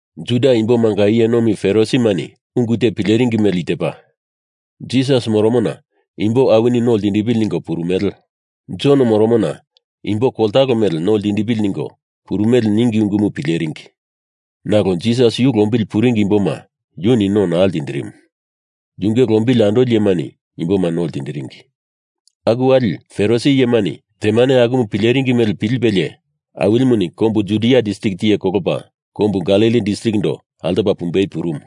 Juda imbomanga iye nomi Farisimani ungu te pileringi mele i tepa, Jisas moromona imbo awini no ltindipili ningo purumele, Jon moromona imbo koltalo mele no ltindipili ningo purumele ningi ungumu pileringi. (Nalo Jisas yu lombili puringi imboma yuni no naa ltindirimu. Yunge lombili andoli iyemani imboma no ltindiringi.) Aku wali, Farisi iyemani temane akumu pileringi mele pilipelie Awilimuni kombu Judia distrik tiye kolopa kombu Galili distrikindo altopa pumbei purumu.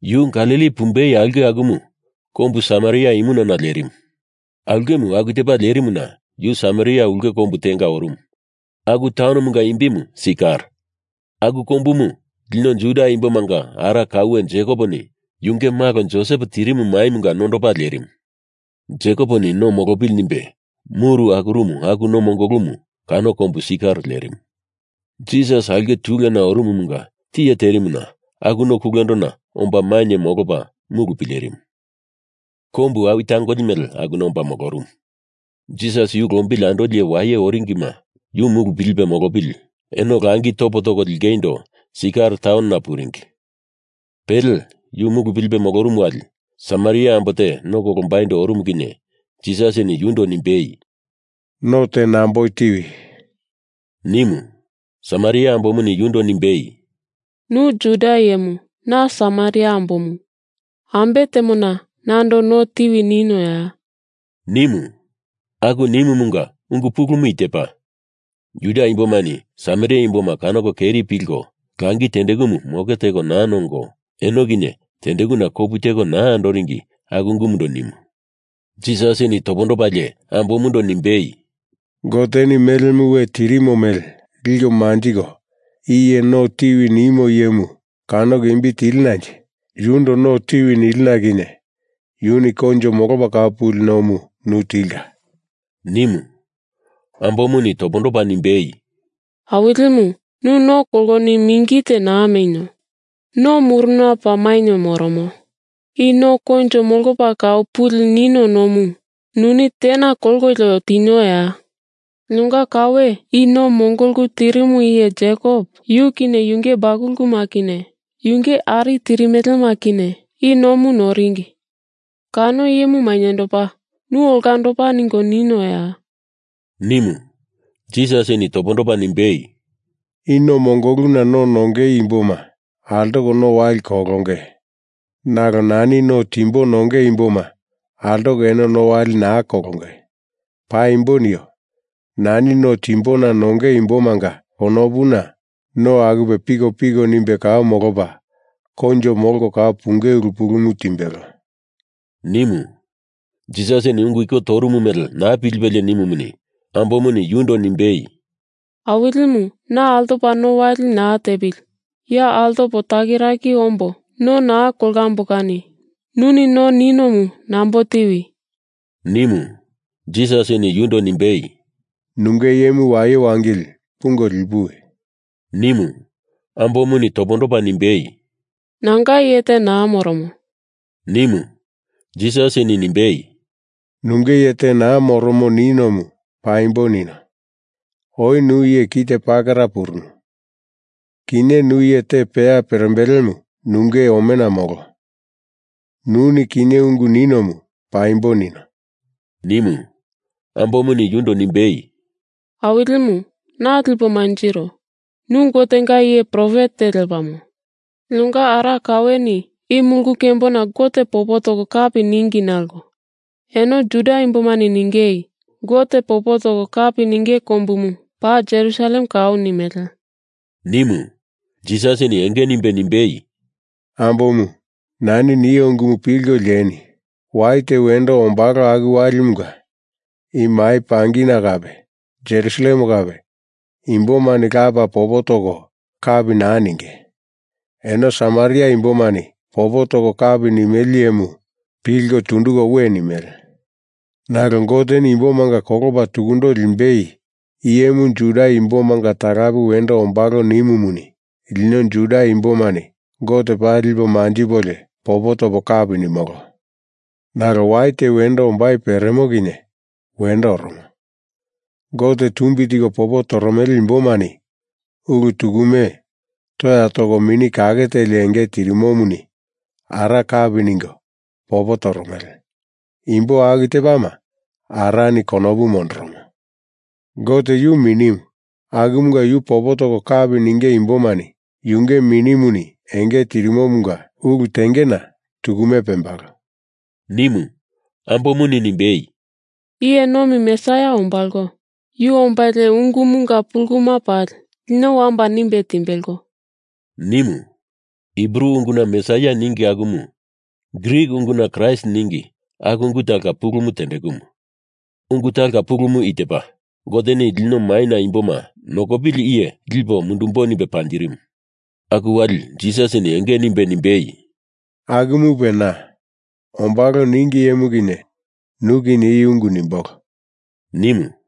Yu Galili pumbei aulke akumu kombu Samaria imunana lerimu. Aulkemu aku tepa lerimuna yu Samaria ulke kombu tenga orumu, aku taunomunga imbimu Sikar. Aku kombumu lino Juda imbomanga ara kaue Jekoponi yunge malo Josep tirimu maimunga nondopa lerimu. Jekoponi no molopili nimbe muru akurumu aku no mongolumu kano kombu Sikar lerimu. Jisas aulke tuluena orumumunga tiye terimuna aku no kulendona omba mainye molopa mulu pilerimu. Kombu awi tangoli mele akuna omba molorumu. Jisas yu lombili andoli iye waye oringima yu mulu pilipe molopili eno langi topo toko lingeindo Sikar taunona puringi. Pele yu mulu pilipe molorumu wali Samaria ambo te no kolombaindo orumu kinye Jisasini yundo nimbei “No te namboi tiwi!” nimu. Samaria ambomuni yundo nimbei, “Nu Juda iyemu. Na Samaria ambomu. Ambe temona nando no tiwi ninoya?” nimu. (Aku nimumunga ungu pulumu i tepa: Juda imbomani Samaria imboma kanoko keri pilko langi tendekumu moke teko naa nongo, eno kinye tendekuna kopu teko naa andoringi aku ungundo nimu.) Jisasini topondopalie ambomundo nimbei, “Goteni melemu we tirimo mele liko manjiko, i iye no tiwi nimu iyemu kanoko imbi tilinanje yundo no tiwi nilino kinye yuni koinjo molopa kau puli nomu nu tilka,” nimu. Ambomuni topondopa nimbei, “Awilimu, nu no koloni mingi te naa menio. No muruna paa mainye moromo. I no koinjo molopa kau puli nino nomu nuni tena kolkolio tinioya? Linonga kaue i no mongolu tirimu iye Jekop, yu kinye yunge bakuluma kinye yunge ari tirimelema kinye i nomu noringi, kano iyemu mainyendopa nu olandopa ningo ninoya?” nimu. Jisasini topondopa nimbei, “I no mongoluna no nongei imboma altopa no wali kolonge, nalo nani no timbo nonge imboma altoko eno no wali naa kolonge. Paimbo nio, nani no timbona nonge imbomanga konopuna no akupe pikopiko nimbe kau molopa, koinjo molko kau punge ulu pulumu timbelo,” nimu. Jisasini ungu iko torumu mele naa pilipelie nimumuni, ambomuni yundo nimbei, “Awilimu, na altopa no wali naa tepili, ya altopo takiraki ombo no naa kolambo kani nuni no ninomu nambo tiwi!” nimu. Jisasini yundo nimbei, “Nunge iyemu waye wangili, pungo lipuwi!” nimu. Ambomuni topondopa nimbei, “Nanga iye te naa moromo,” nimu. Jisasini nimbei, “Nunge iye te naa moromo ninomu paimbo nino. Oi nu iye kite pakera purunu. Kinye nu iye te peya perembelemu nunge omena molo. Nuni kinye ungu ninomu paimbo nino,” nimu. Ambomuni yundo nimbei, “Awilimu, na lipo manjiro, nu Gotenga iye profet te lepamo. Linonga ara kaueni i mulu kembona Gote popo toko kapi ningi nalo eno Juda imbomani ningei, Gote popo toko kapi ninge kombumu paa Jerusalem kau, nimele,” nimu. Jisasini enge nimbe nimbei, “Ambomu, nani nio ungumu pilko lieni! Wai te wendo ombalo aku walimunga i mai pangina kape Jerusalem kape imbomani Lapa popo toko kapi naa ninge. Eno Samaria imbomani popo toko kapi nimele iyemu pilko tunduko we nimele. Nalo Goteni imbomanga kolopa tukundo limbei iyemu Juda imbomanga talape wendo ombalo nimumuni lino Juda imbomani Gote paa lipo manjipolio popo topo kapi nimolo. Nalo wai te wendo ombai pereremo kinye wendo oromo. Gote tumbi tiko popo toromele imbomani ulu tukume toya toko Mini Kake Teli enge tirimomuni Ara kapi ningo popo toromele. Imbo aku tepama Arani konopu mondoromo. Gote yu minimu, akumunga yu popo toko kapi ninge imbomani yunge Minimuni enge tirimomunga ulu tengena tukume pembalo,” nimu. Ambomuni nimbei, “Iye nomi Mesaia ombalo. Yu ombalie ungumunga puluma pali lino wamba nimbe timbelo,” nimu. (Hibru unguna Mesaia ningi akumu, Grik unguna Kraist ningi aku ungu talonga pulumu tendekumu. Ungu talonga pulumu i tepa, Goteni lino maina imboma nokopili iye lipo mundumbo nimbe panjirimu.) Aku wali Jisasini enge nimbe nimbei, “Akumupe na. Ombalo ningi iyemu kinye nu kinye i ungu nimbolo,” nimu.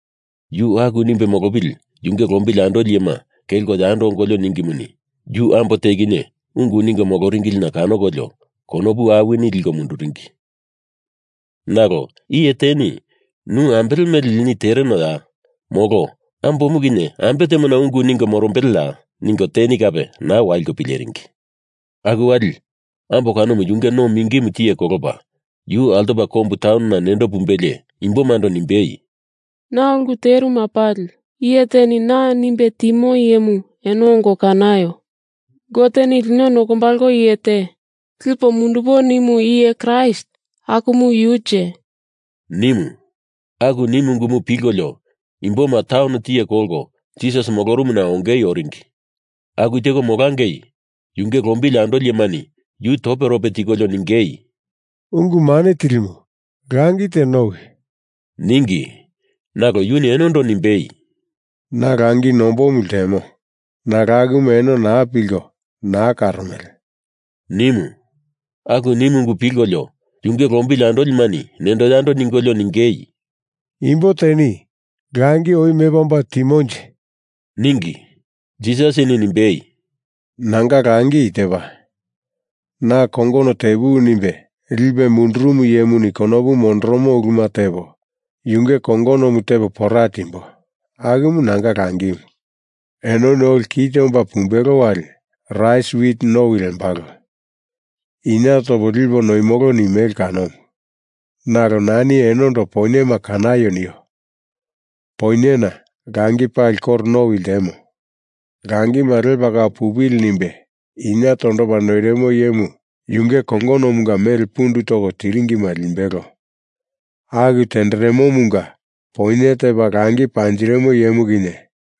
Yu aku nimbe molopili yunge lombili andoli iyema kelko yando ongolio ningimuni, yu ambo te kinye ungu ningo moloringilina kanokolio konopu awini liko munduringi. Nalo iye teni ‘Nu ambele mele lini terenoya?’ molo ‘Ambomu kinye ambe temona ungu ningo morombeleya?’ ningo teni kape naa waliko pileringi. Aku wali ambo kanomu yunge no mingimu tiye kolopa yu altopa kombu taunona nendo pumbelie imbomando nimbei, “Na ulu teruma pali iye teni na nimbe timo iyemu eno ongo kanaio! Goteni lino nokombalo iye te lipo mundumbo nimu iye Kraist akumu yunje?” nimu. Aku nimu ungumu pilkolio imboma taun tiye kolko Jisas molorumuna ongei oringi. Aku teko molangei yunge lombili andolimani yu toperope tikolio ningei, “Ungu Mane Tilimu, langi te nowi,” ningi. Nalo yuni enondo nimbei, “Na langi nombomu ltemo, nalo akumu eno naa pilko naa karomele,” nimu. Aku nimu ungu pilkolio yunge lombili andolimani nendo yando ningolio ningei, “Imbo teni langi oi mepa omba timonje?” ningi. Jisasini nimbei, “Nanga langi i tepa, Na kongono tepuwi nimbe lipe mundurumu iyemuni konopu mondoromo uluma tepo, yunge kongonomu tepo pora timbo. Akumu nanga langimu. Enoni oli kite omba pumbelo wali rais wit nowi lembalo, inie topo lipo noimolo nimele kanomu. Nalo nani enondo poinyema kanaio nio! Poinyena langi pali koro nowi ltemo. Langima lepa kau pupili nimbe inie tondopa noirimo iyemu yunge kongonomunga mele pundu toko tiringima limbelo. Aku tenderemomunga poinye tepa langi panjirimu iyemu kinye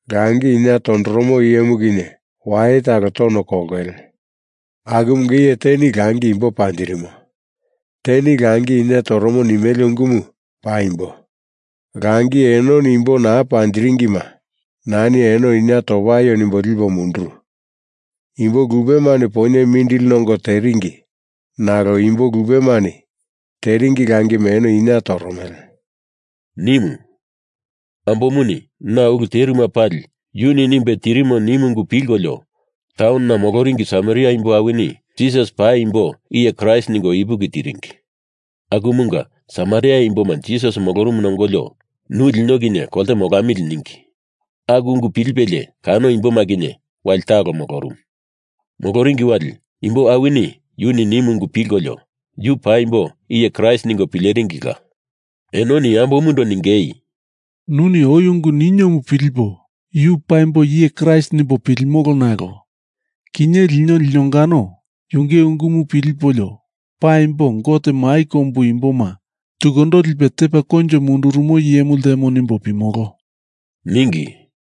langi inie tondoromo iyemu kinye waye talo tono kolongele. Akumunga iye teni langi imbo panjirimo, teni langi inie toromo nimele ungumu paimbo. Langi enoni imbo naa panjiringima nani eno inie topaio nimbo lipo munduru. Imbo lupemani poinye mindili nongo teringi, nalo imbo lupemani teringi langima eno inie toromele,” nimu. Ambomuni na ulu teruma pali yuni nimbe tirimo nimu ungu pilkolio taunona moloringi Samaria imbo awini Jisas paimbo iye Kraist ningo ipuki tiringi. Akumunga Samaria imboma Jisas molorumuna ongolio, nu lino kinye kolte molamili ningi. Aku ungu pilipelie kano imboma kinye wali talo molorumu. Moloringi wali imbo awini yuni nimu unguma pilkolio yu paimbo iye Kraist ningo pileringila. Enoni ambomundo ningei, “Nuni oi ungu niniomu pilipo yu paimbo iye Kraist nimbo pilimolo nalo kinye lino linongano yunge ungumu pilipolio paimbo, Gote mai kombu imboma tukundo lipe tepa koinjo mundurumo iyemu ltemo nimbo pimolo,” ningi.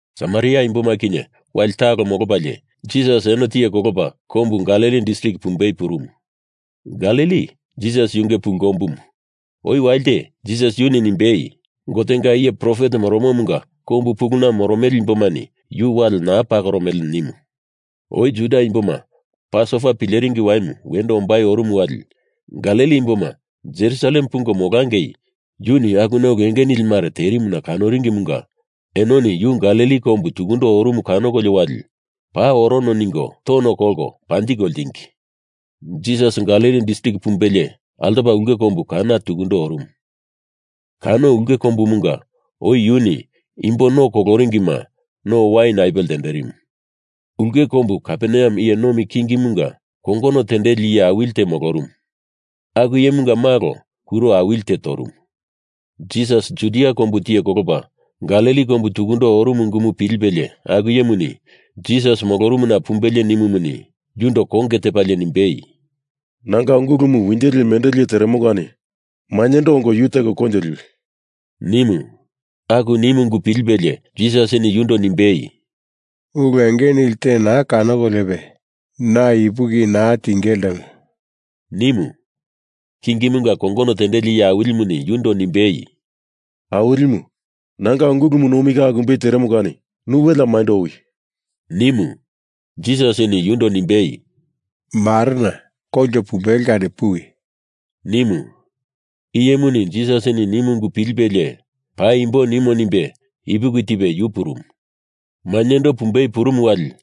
Samaria imboma kinye wali talo molopalie Jisas eno tiye kolopa kombu Galili distrik pumbei purumu. Galili Jisas yunge pulu kombumu. Oi walite Jisas yuni nimbei, “Gotenga iye profet moromomunga kombu puluna moromele imbomani yu wale naa pakoromele,” nimu. Oi Juda imboma Pasova Pileringi Waimu wendo orumu wali Galili imboma Jerusalem pungo molangei yuni akuna ulu enge nili mare terimuna kanoringimunga enoni yu Galili kombu tukundo orumu kanokolio wali paa orono ningo tono kolko panjiko ltingi. Jisas Galili distrik pumbelie altopa ulke kombu Kana tukundo orumu. Kano ulke kombumunga oi yuni imbo no koloringima no wain apuwe ltenderimu. Ulke kombu Kaperneam iye nomi kingimunga kongono tendeli iye awili te molorumu, aku iyemunga malo kuro awili te torumu. Jisas Judia kombu tiye kolopa Galili kombu tukundo orumu ungumu pilipelie aku iyemuni, Jisas molorumuna pumbelie nimumuni, yundo konge tepalie nimbei, “Nanga ungulumu winjo lie mendo lie teremo kani mainyendo ongo yu teko koinjo liwi,” nimu. Aku nimu ungu pilipelie Jisasini yundo nimbei, “Ulu enge nili te naa kanokoliope na ipuki naa tinge ltemo,” nimu. Kingimunga kongono tendeli iye awilimuni yundo nimbei, “Awilimu, nanga ungulumu nomi ka akumbei teremo kani nu welea maindo owi!” nimu. Jisasini yundo nimbei, “Marena koinjo pumbelo kani puwi!” nimu. Iyemuni Jisasini nimu ungu pilipelie paimbo nimo nimbe ipuki tipe yu purumu. Mainyendo pumbei purumu wali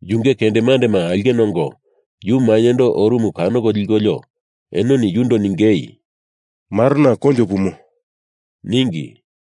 yunge kendemandema aulkena ongo yu mainyendo orumu kanoko likolio enoni yundo ningei, “Marena koinjo pumo,” ningi.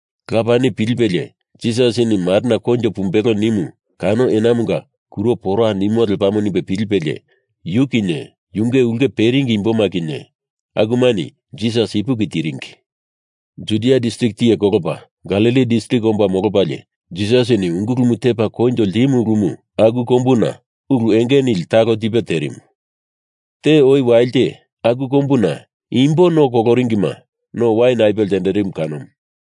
Lapani pilipelie Jisasini marena koinjo pumbelo nimu kano enamunga kuro pora nimo lepamo nimbe pilipelie, yu kinye yunge ulke peringi imboma kinye akumani Jisas ipuki tiringi. Judia distrik tiye kolopa Galili distrik omba molopalie Jisasini ungulumu tepa koinjo ltimu ulumu aku kombuna ulu enge nili talo tipe terimu. Te oi walite aku kombuna imbo no koloringima no wain apuwe ltenderimu kanomu.